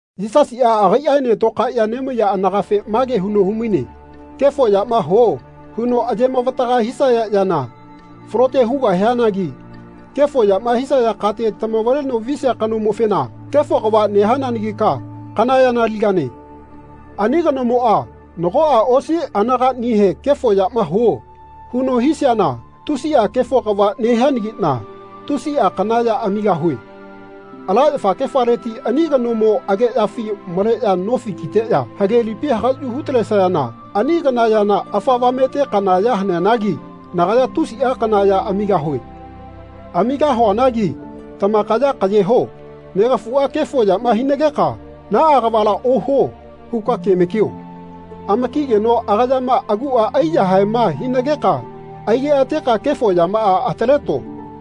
Yisasiꞌa agaiꞌaene tokaeꞌya nemaiya anagafe mage huno humaine kefo yama huo huno ayemavataga hisaya yana falote hugahianagi kefo yama hisaya kate tamavaleno visia kanomofena “Kefo kava nehananagika kana yana aligane.” Ani kanomoꞌa nagoꞌa osi anagaꞌnihe “Kefo yama huo.” huno hisiana tusiꞌa kefo kava nehianagiꞌna tusiꞌa kana ya amigahue. Ala yafakefaleti ani kanomo ageꞌyafi maleꞌya nofi kiteꞌya hage lipi hagaꞌyu hutalesayana ani kana yana afa avamete kana ya haneanagi nagaya tusiꞌa kana ya amigahue. Amigahuanagi tamakaya kaꞌye ho. Negafuꞌa kefo yama hinageka “Naꞌa kavala ohuo.” huka kemakio. Amakigeno agayama aguꞌa aiyahaeꞌma hinageka aigeꞌateka kefo yamaꞌa ataleto.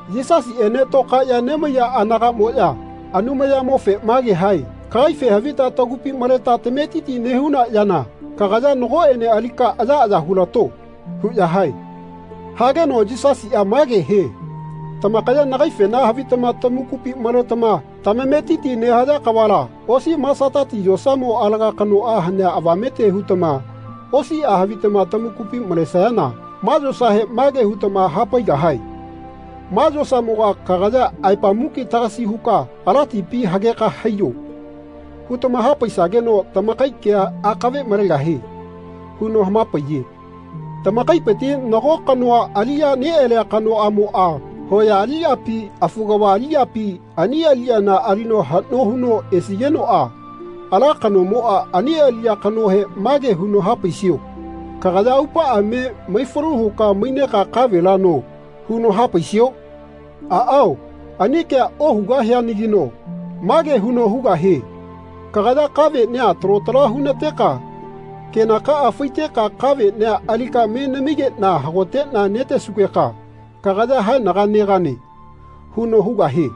Yisasiꞌene tokaeꞌya nemaiya anagaꞌmoꞌya Anumayamofe mage hae “Kagaife havita tagupi maleta tametiti nehuna yana kagaya nagoꞌene alika ayaꞌaya hulato.” huꞌya hae. Hageno Yisasiꞌa mage hie “Tamakaya nagaifena havitama tamakupi maletama tamametiti nehaya kavala osi masatati yosamo alaga kanoꞌa hanea avamete hutama osiꞌa havitama tamakupi malesayana ma yosahe mage hutama hapaigahae ‘Ma yosamoga kagaya aepa muki tagasi huka ala tipi hageka haiyo.’ hutama hapaisageno tamakai kea akave malegahie.” huno hamapaiye. Tamakaipiti nago kanoa aliꞌya neꞌalia kanoꞌamoꞌa hoya aliꞌyapi, afu kava aliꞌyapi, ani aliꞌyana alino haꞌno huno esigenoꞌa ala kanomoꞌa ani aliꞌya kanohe mage huno hapaisio “Kagaya aupaꞌa me maifalu huka maineka kavela no.” huno hapaisio? Aꞌao ani kea ohugahianagino mage huno hugahie “Kagaya kaveꞌnia talo tala hunateka kenakaꞌa faiteka kaveꞌnia alika me namigeꞌna hagoteꞌna netesugeka kagaya haenaga negane.” huno hugahie.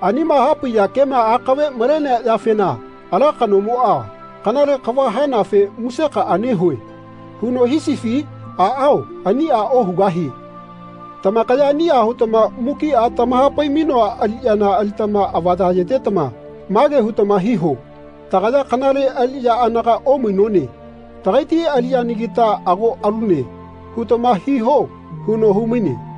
Anima hapaiya kema akave malenea yafena ala kanomoꞌa “Kanale kava hanafe musekaꞌa nehue.” huno hisifi? Aꞌao aniꞌa ohugahie. Tamakaya aniꞌa hutama mukiꞌa tamahapai-mainoa aliꞌyana alitama avaya ayetetama mage hutama hiho “Tagaya kanale aliꞌya anaga omainone. Tagaiti aliꞌyanagita ago alune.” hutama hiho huno humaine.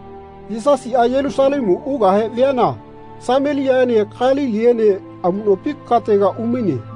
Yisasiꞌa Yelusalemu ukahe viana Sameliaꞌene Kaliliene amuꞌnopi katega umaine.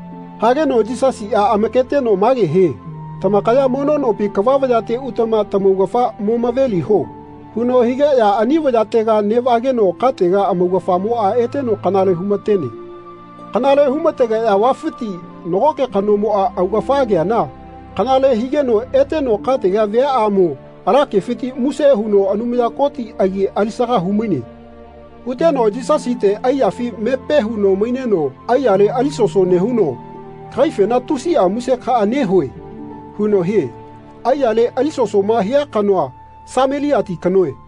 Hageno Yisasiꞌa amaketeno mage hie “Tamakaya mono nopi kava vayate utama tamaugafa momaveliho.” huno higeꞌya ani vayatega neꞌvageno katega amaugafamoꞌa eteno kanale humatene. Kanale humategeꞌya vafiti nagoke kanomoꞌa augafa ageana kanale higeno eteno katega viaꞌamo ala kefiti muse huno Anumaya Koti agi alisaga humaine. Huteno Yisasite aiyafi mepe huno maineno aiyale alisoso nehuno “Kagaifena tusiꞌa musekaꞌa nehue.” huno hie. Aiyale alisosoma hia kanoa Sameliati kanoe.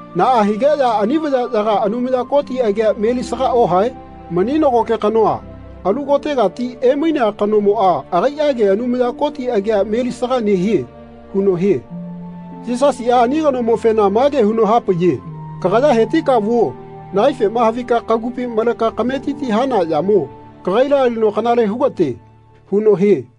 Naꞌa higeꞌya ani vayaꞌyaga Anumaya Koti agia melisaga ohae? Mani nagoke kanoa alu kotegati emainea kanomoꞌa agaiꞌage Anumaya Koti agia melisaga nehie.” huno hie. Yisasiꞌa ani kanomofena mage huno hapaiye “Kagaya hetika vuo. Nagaifema havika kagupi maleka kametiti hana yamo kagaila alino kanale hugate.” huno hie.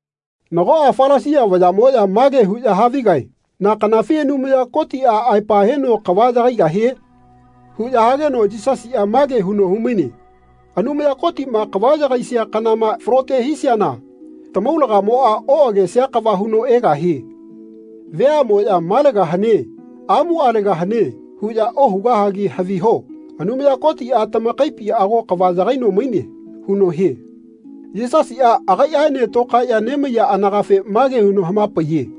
Nagoꞌa Falasia vayaꞌmoꞌya mage huꞌya havigae “Na kanafi Anumaya Kotiꞌa aepa heno kava yagaigahie?” huꞌya hageno Yisasiꞌa mage huno humaine “Anumaya Kotiꞌma kava yagaisia kanama falote hisiana tamaulagamoꞌa oꞌagesia kava huno egahie. Veaꞌmoꞌya ‘Malega hane. Amualega hane.’ huꞌya ohugahagi haviho Anumaya Kotiꞌa tamakaipi ago kava yagaino maine.” huno hie. Yisasiꞌa agaiꞌaene tokaeꞌya nemaiya anagafe mage huno hamapaiye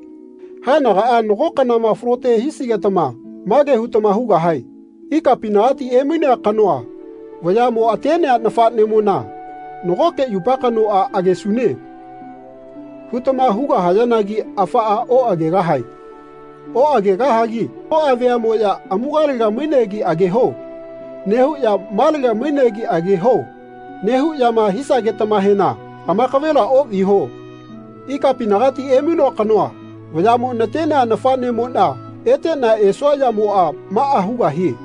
“Haenagaꞌa nago kanama falote hisigetama mage hutama hugahae ‘Ikapinagati emainea kanoa vayaꞌmo atenea nafaꞌnemona nagoke yupa kanoꞌa agesune.’ hutama hugahayanagi afaꞌa oꞌagegahae. Oꞌagegahagi nagoꞌa veaꞌmoꞌya ‘Amugalega mainegi ageho.’ nehuꞌya ‘Malega mainegi ageho.’ nehuꞌyama hisagetamahena amakavela oꞌviho. Ikapinagati emainoa kanoa vayaꞌmo natenea nafaꞌnemoꞌna eteꞌna esua yamoꞌa maꞌa hugahie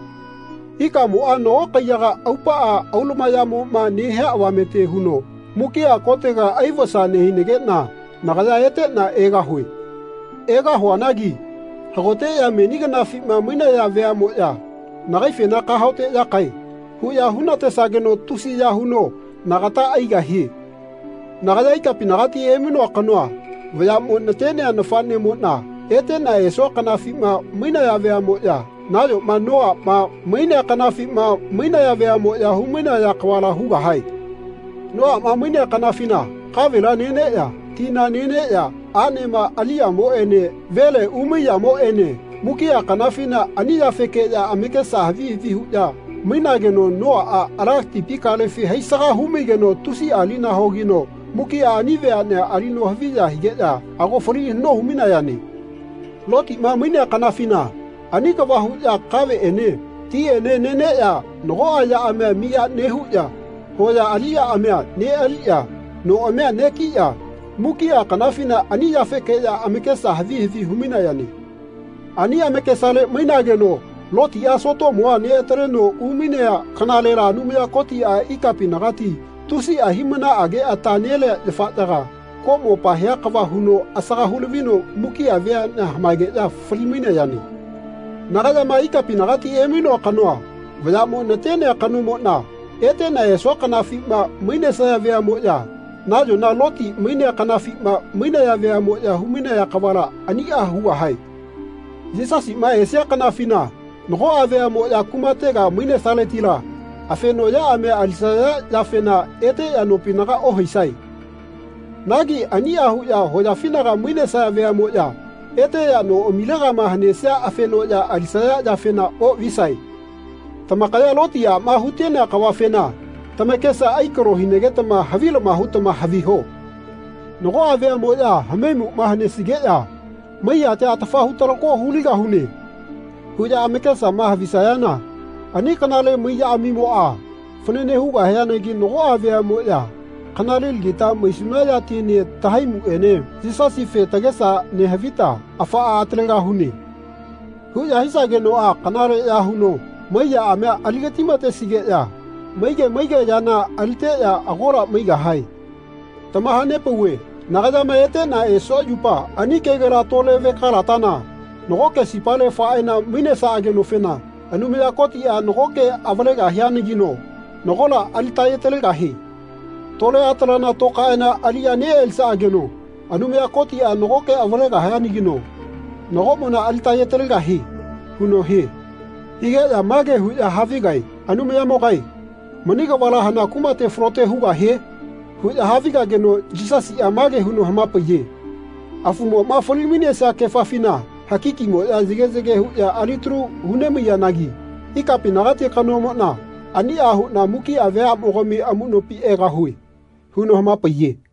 ikamoꞌa nago kaiyaga aupaꞌa aulumayaꞌmoꞌma nehia avamete huno mukiꞌa kotega aivasa nehinageꞌna nagaya eteꞌna egahue. Egahuanagi hagoteꞌya meni kanafima mainaya veaꞌmoꞌya nagaifena ‘Kahaoteꞌyakae.’ huꞌya hunatesageno tusiya huno nagata aigahie. Nagaya ikapinagati emainoa kanoa vayaꞌmo natenea nafaꞌnemoꞌna eteꞌna esua kanafima mainaya veaꞌmoꞌya nayoma Noaꞌma mainea kanafima mainaya veaꞌmoꞌya humainaya kavala hugahae. Noaꞌma mainea kanafina kavela neneꞌya tina neneꞌya aꞌnema aliyamoꞌene vele uyamoꞌene mukiꞌa kanafina ani yafekeꞌya amakesa havi havi huꞌya mainageno Noaꞌa ala tipi kalefi haisaga humaigeno tusiꞌa lina hogino mukiꞌa ani veaꞌnea alino haviya higeꞌya ago fali haꞌno humainayane. Lotiꞌma mainea kanafina ani kava huꞌya kaveꞌene tiꞌene neneꞌya nagoꞌa yaꞌamia miya nehuꞌya hoya aliꞌyaꞌamia neꞌaliꞌya noꞌamia negiꞌya mukiꞌa kanafina ani yafekeꞌya amakesa havi havi humainayane. Ani amakesale mainageno Lotiꞌa Sotomua neꞌataleno umainea kanalela Anumaya Kotiꞌa ikapinagati tusiꞌa hiꞌmanaꞌage ata nelea yafaꞌyaga koꞌmopa hia kava huno asaga hulavino mukiꞌa veaꞌnea hamaegeꞌya fali-mainayane. Nagayama ikapinagati emainoa kanoa vayaꞌmo natenea kanomoꞌna eteꞌna esua kanafima mainesaya veaꞌmoꞌya nayona Loti mainea kanafima mainaya veaꞌmoꞌya humainaya kavala aniꞌa hugahae. Yisasiꞌma esia kanafina nagoꞌa veaꞌmoꞌya kumatega mainesaletila afenoꞌyaꞌamia alisaya yafena eteꞌya nopinaga ohaisae. Nagi aniꞌa huꞌya hoyafinaga mainesaya veaꞌmoꞌya eteꞌya noꞌamilegama hanesea afenoꞌya alisaya yafena oꞌvisae. Tamakaya Loti aꞌmoma hutenea kavafena tamakesa aikalo hinagetama havilama hutama haviho. Nagoꞌa veaꞌmoꞌya hamaimuꞌma hanesigeꞌya ‘Mai yatia atafa hutalako huligahune.’ huꞌya amakesama havisayana ani kanale mai yaꞌamimoꞌa fanane hugahianagi nagoꞌa veaꞌmoꞌya ‘Kanalelagita maisuna yatiene tahaimuene Yisasife tagesa nehavita afaꞌa atalegahune.’ huꞌya hisagenoꞌa kanaleꞌya huno mai yaꞌamia aligatimatesigeꞌya maige maige yana aliteꞌya agola maigahae. Tamahanepauve nagayama eteꞌna esua yupa ani kegela tole vekalatana nagoke sipale faeꞌana mainesaꞌagenofena Anumaya Kotiꞌa nagoke avalegahianagino nagola alitaye-talegahie. Tole atalana tokaeꞌana aliꞌya neꞌalisaꞌageno Anumaya Kotiꞌa nagoke avalegahianagino nagoꞌmona alitaye-talegahie.” huno hie. Higeꞌya mage huꞌya havigae “Anumayamogae mani kavala hana kumate falote hugahie?” huꞌya havigageno Yisasiꞌa mage huno hamapaiye “Afumoꞌma fali-mainesia kefafina hakikimoꞌya yage yage huꞌya alitalu hunemaiyanagi ikapinagati kanomoꞌna aniꞌa huꞌna mukiꞌa veaꞌmogami amuꞌnopi egahue.” huno hamapaiye.